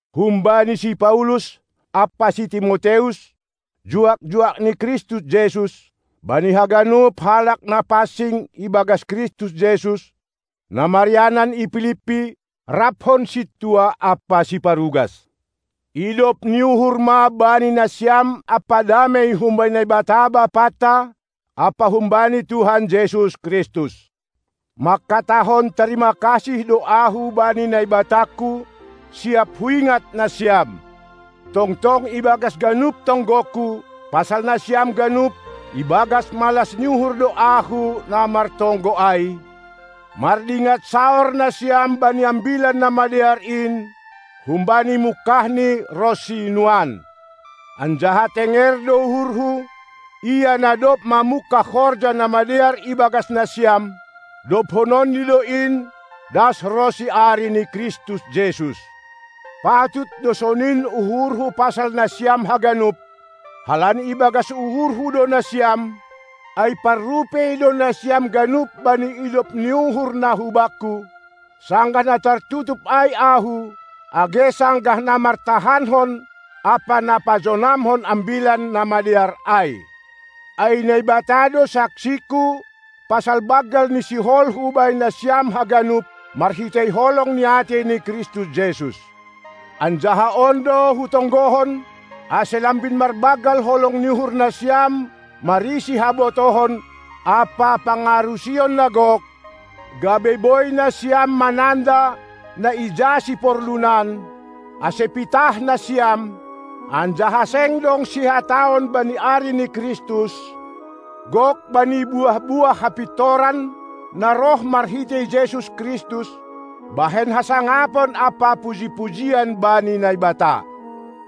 Humbani si Paulus ampa si Timoteus, juak-juak ni Kristus Jesus, bani haganup halak na pansing ibagas Kristus Jesus, na marianan i Pilippi, raphon sintua ampa siparugas: Idop ni uhur ma bani nasiam ampa damei humbani Naibata Bapanta ampa humbani Tuhan Jesus Kristus! Mangkatahon tarima kasih do ahu bani Naibatangku siap huingat nasiam. Tongtong ibagas ganup tonggongku pasal nasiam ganup, ibagas malas ni uhur do ahu na martonggo ai, mardingat saor nasiam bani Ambilan Namadear in humbani mungkahni ronsi nuan. Anjaha tenger do uhurhu: Ia, na dob mamungkah horja na madear ibagas nasiam, dobhononNi do in das ronsi ari ni Kristus Jesus. Patut do sonin uhurhu pasal nasiam haganup, halani ibagas uhurhu do nasiam, ai parrupei do nasiam ganup bani idop ni uhur na hubakku, sanggah na tartutup ai ahu age sanggah na martahankon ampa na pajonamkon ambilan namadear ai. Ai Naibata do saksingku pasal banggal ni siholhu bani nasiam haganup marhitei holong ni atei ni Kristus Jesus. Anjaha on do hutonggohon, ase lambin marbanggal holong ni uhur nasiam marisi habotohon ampa pangarusion na gok, gabe boi nasiam mananda na ija siporlunan, ase pitah nasiam, anjaha seng dong sihataon bani ari ni Kristus, gok bani buah-buah hapintoran, na roh marhitei Jesus Kristus, bahen hasangapon ampa puji-pujian bani Naibata.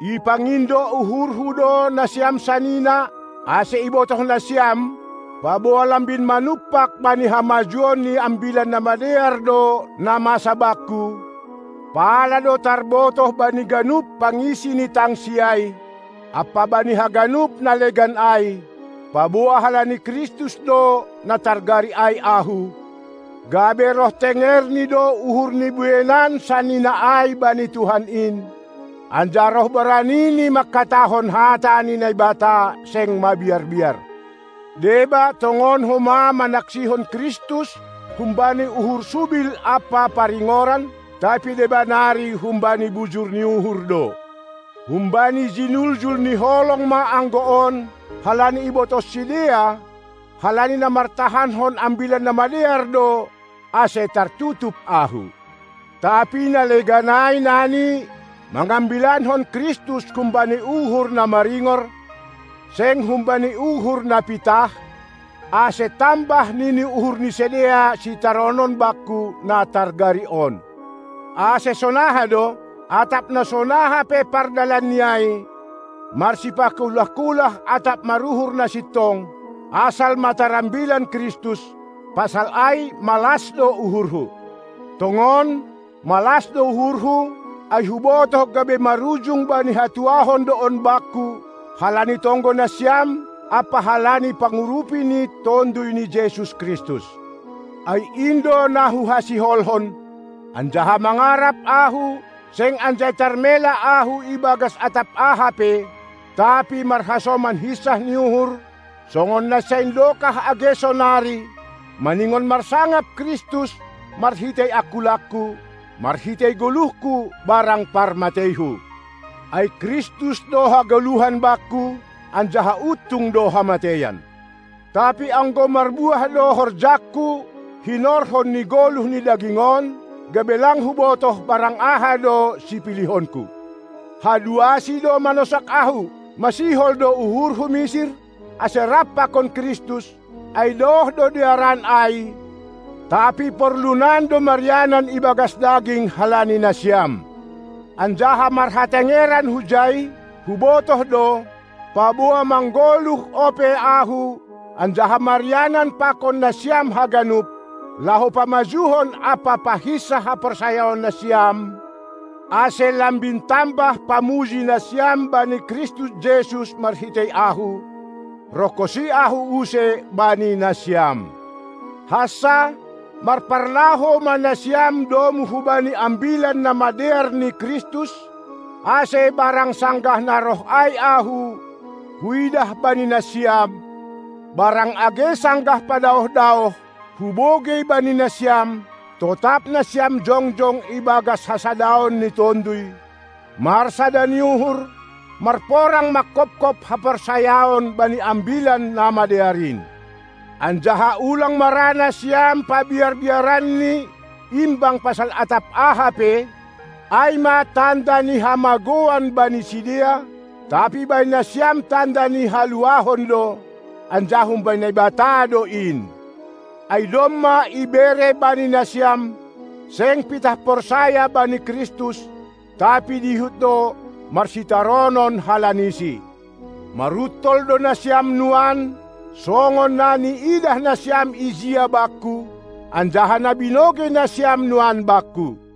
Ipangindo uhurhu do nasiam sanina, ase ibotoh nasiam, paboa lambin manumpak bani hamajuon ni Ambilan Namadear do na masa bakku, pala do tarbotoh bani ganup pangisi ni tangsi ai ampa bani haganup na legan ai, paboa halani Kristus do na targari ai ahu, gabe roh tengerni do uhur ni bueinan sanina ai bani Tuhan in, anjaha roh boranini mangkatahon hata ni Naibata seng mabiar-biar. Deba tongon homa manaksihon Kristus humbani uhur subil ampa paringoran, tapi deba nari humbani bujur ni uhur do. Humbani jinuljul ni holong ma anggo on, halani ibotoh sidea, halani na martahankon Ambilan Namadear do, ase tartutup ahu. Tapi na legan ai nani mangambilankon Kristus humbani uhur na maringor, seng humbani uhur na pitah, ase tambah nini uhur ni sidea sitaronon bakku na targari on. Ase sonaha do? Atap na sonaha pe pardalan ni ai, marsipakulah-kulah atap maruhur na sintong, asal ma tarambilan Kristus; pasal ai malas do uhurhu. Tongon, malas do uhurhu, ai hubotoh gabe marujung bani hatuahon do on bakku halani tonggo nasiam ampa halani pangurupi ni Tonduy ni Jesus Kristus. Ai in do na huhasiholhon, anjaha mangarap ahu seng anjai tarmela ahu ibagas atap aha pe, tapi marhasoman hinsah ni uhur, songon nasaindokah age sonari, maningon marsangap Kristus marhitei angkulangku, marhitei goluhku barang parmateihu. Ai Kristus do hagoluhan bakku, anjaha untung do hamateian. Tapi anggo marbuah do horjangku hinorhon ni goluh ni daging on, gabe lang hubotoh barang aha do sipilihonku. Haduasi do manosak ahu: Masihol do uhurhu misir, ase rap pakon Kristus, ai daoh do dearan ai, tapi porlunan do marianan ibagas daging halani nasiam. Anjaha marhatengeran hujai, hubotoh do, paboa manggoluh ope ahu anjaha marianan pakon nasiam haganup, laho pamajuhon ampa pahinsah haporsayaon nasiam, ase lambin tambah pamuji nasiam bani Kristus Jesus marhitei ahu, rohkonsi ahu use bani nasiam. Hansa, marparlahou ma nasiam domu hubani Ambilan Namadear ni Kristus, ase barang sanggah na roh ai ahu, huidah bani nasiam, barang age sanggah padaoh-daoh, hubogei bani nasiam, totap nasiam jongjong ibagas hasadaon ni tonduy, marsada ni uhur, marporang manghophop haporsayaon bani Ambilan Namadear in. Anjaha ulang ma ra nasiam pabiar-biaran ni imbang pasal atap aha pe, ai ma tanda ni hamagouan bani sidea, tapi bani nasiam tanda ni haluahon do, anjaha humbani Naibata do in. Ai domma ibere bani nasiam, seng pitah porsaya bani Kristus, tapi dihut do marsitaronon halani-Si. Maruntol do nasiam nuan, songon na niidah nasiam ijia bakku, anjaha na binogei nasiam nuan bakku.